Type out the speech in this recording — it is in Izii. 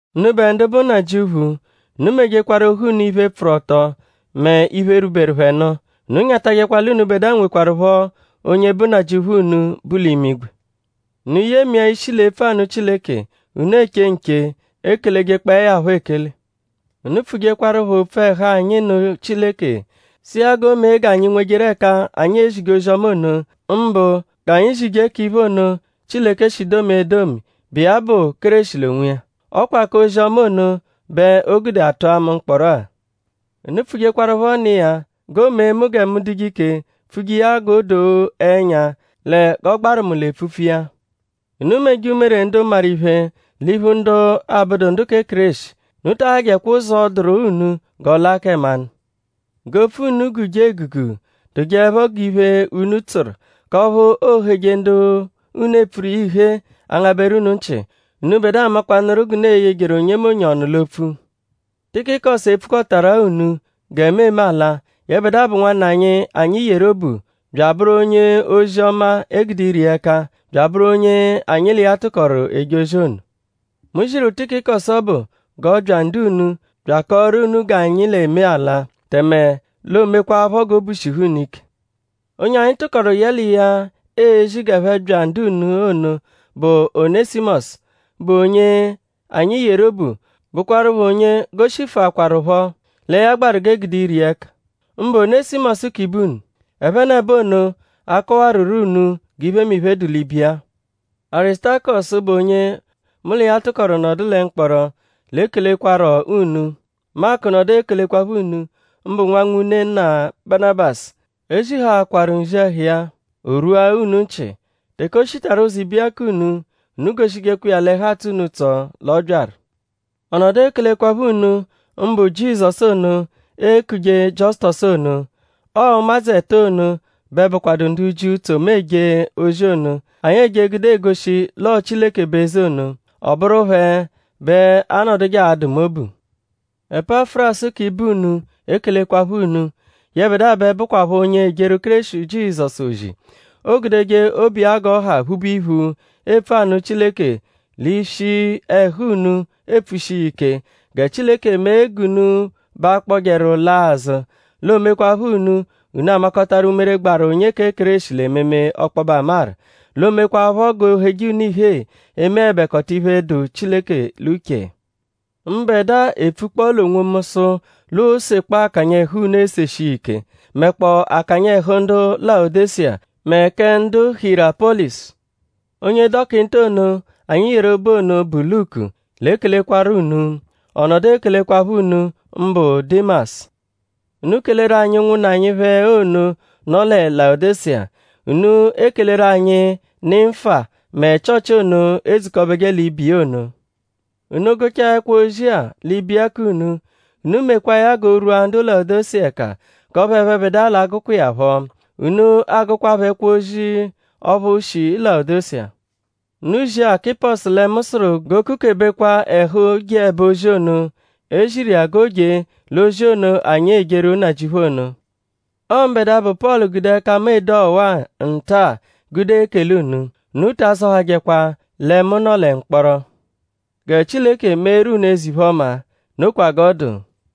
Unubẹ ndu bụ nnajịuphu; unu mejekwaru ohu unu iphe, pfụru ọto mẹ iphe, rwuberu phẹ nụ. Unu nyatajẹkwa l'unubẹdua nwekwarụpho onye bụ Nnajịuphu unu, bu l'imigwe. Unu yemia ishi l'epfu anụ Chileke; unu eche nche; ekelejekpọe ya phọ ekele. Unu pfujekwarụpho opfu ẹhu anyi nụ Chileke sụ iya g'o mee g'anyi nwejeru ẹka anyi e-zije ozi-ọma ono; mbụ g'anyi zije k'iphe ono, Chileke shi domia edomi, bụ iya bụ Kéreshi l'onwiya. Ọ kwa k'ozi-ọma ono bẹ o gude a tụa mu mkpọro-a. Unu pfujekwarụpho nụ iya g'o mee mu gẹ mu dụje ike pfuje iya g'o doo ẹnya lẹ g'ọ gbaru mu l'epfupfu iya. Unu meje umere ndu maru iphe l'iphu ndu abụdu ndu kẹ Kéreshi. Unu ta ahajẹkwa ụzo dụru unu g'ọ laa kẹ mmanụ. G'opfu unu guje egugu; dụjeepho g'iphe, únú tsụru; k'ọphu ooheje ndu unu epfuru iya ihee angabẹru unu nchị. Unubẹdua amakwanụru g'unu e-yejeru onyemonye ọnu l'opfu. Tikikọsu e-pfukọtarua unu gẹ mu eme ala. Yẹbedua bụ nwanna anyi, anyi yeru obu; bya abụru onye-ozi-ọma, e gude ire iya ẹka; bya abụru onye anyi l'iya tụkoru eje ozi ono. Mu ziru Tikikọsu ọbu g'ọ bya ndu-unu bya akọoru unu g'anyi l'eme ala; tẹme l'oo-mekwaaphọ g'obu shihu unu ike. Onye anyi tụkoru yẹ l'iya ezi g'ẹphe bya ndu-unu ono bụ Onẹsimosu, bụ onye anyi yeru obu; bụkwarupho onye goshifuakwaruphọ lẹ ya gbaru g'e gude ire iya ẹka; mbụ Onẹsimosu k'ibe unu. Ẹphenebo ono a-kọwaruro unu g'iphemiphe, dụ l'ibiya-a. Arisutakọsu, bụ onye mu l'iya tụkoru nọdu lẹ mkpọro l'ekelekwarọ unu. Maku nọdu ekelekwaphọ unu; mbụ nwa nwune-nna Banabasu. E zihaakwaru nzi ẹhu iya; o rwua unu nchị. Teke o shitaru ụzo ibiya k'unu; unu goshijekwa iya l'ẹhu atsọ unu ụtso l'ọ byaru. Ọ nọdu ekelekwaphọ unu mbụ Jizọsu ono, eekuje Jiọsutosu ono. Ọo ụmadzu ẹto ono bẹ bụkwadu ndu Jiu, tso mu eje ozi ono, anyi eje gude egoshi l'ọo Chileke bụ eze ono. Ọ bụru phẹ bẹ anọduje adụ mu obu. Epafurasu k'ibe unu ekelekwaphọ unu. Yẹbedua bẹ bụkwapho onye ejeru Kéreshi Jizọsu ozi. Oogudeje obu iya g'ọ ha phube iphu epfu anụ Chileke l'ishi ẹhu unu epfushi iya ike. Gẹ Chileke mee g'unu ba akpọjeru laa azụ; l'oomekwaphọ unu: unu amakọtaru umere, gbaru onye kẹ Kéreshi l'ememe ọkpobe amaru; l'oomekwaphọ g'o heje unu ihee emeẹbekota iphe, dụ Chileke l'uche. Mbẹdua epfukpọo l'onwomu sụ l'oosekpọ akanya ẹhu unu eseshi iya ike; mẹkpoo akanya ẹhu ndu Layodeshiya; mẹ kẹ ndu Hiyerapọlisu. Onye dọkinta ono, anyi yeru obu ono, bụ Luku l'ekelekwarọ unu. Ọ nọdu ekelekwaphọ unu mbụ Dimasu. Unu keleru anyi ụnwunna anyi phẹ ono, nọ lẹ Layodeshiya. Unu ekeleru anyi Nimfa mẹ Chịochi ono, edzukọbeje l'ibe iya ono. Unu -gụchaa ẹkwo-ozi-a l'ibiya k'unu; unu mekwaa ya g'o rwua ndu Layodeshiya ẹka k'ọphu ẹphebedua l'a-gụkwa iya phọ. Unu agụkwaapho ẹkwo-ozi ọphu shi Layodeshiya. Unu zia Akịposu lẹ mu sụru g'o kukebekwa ẹhu jeẹbe ozi ono, e ziru iya g'o jee l'ozi ono, anyi ejeru Nnajịuphu ono. Ọo mbẹdua, bụ Pọlu gude ẹka mu ede ọwa-a nta-a gude ekele unu. Unu ta azọhajekwa lẹ mu nọ lẹ mkpọro. Gẹ Chileke meeru unu eze-iphe-ọma. Nokwa g'ọ dụ.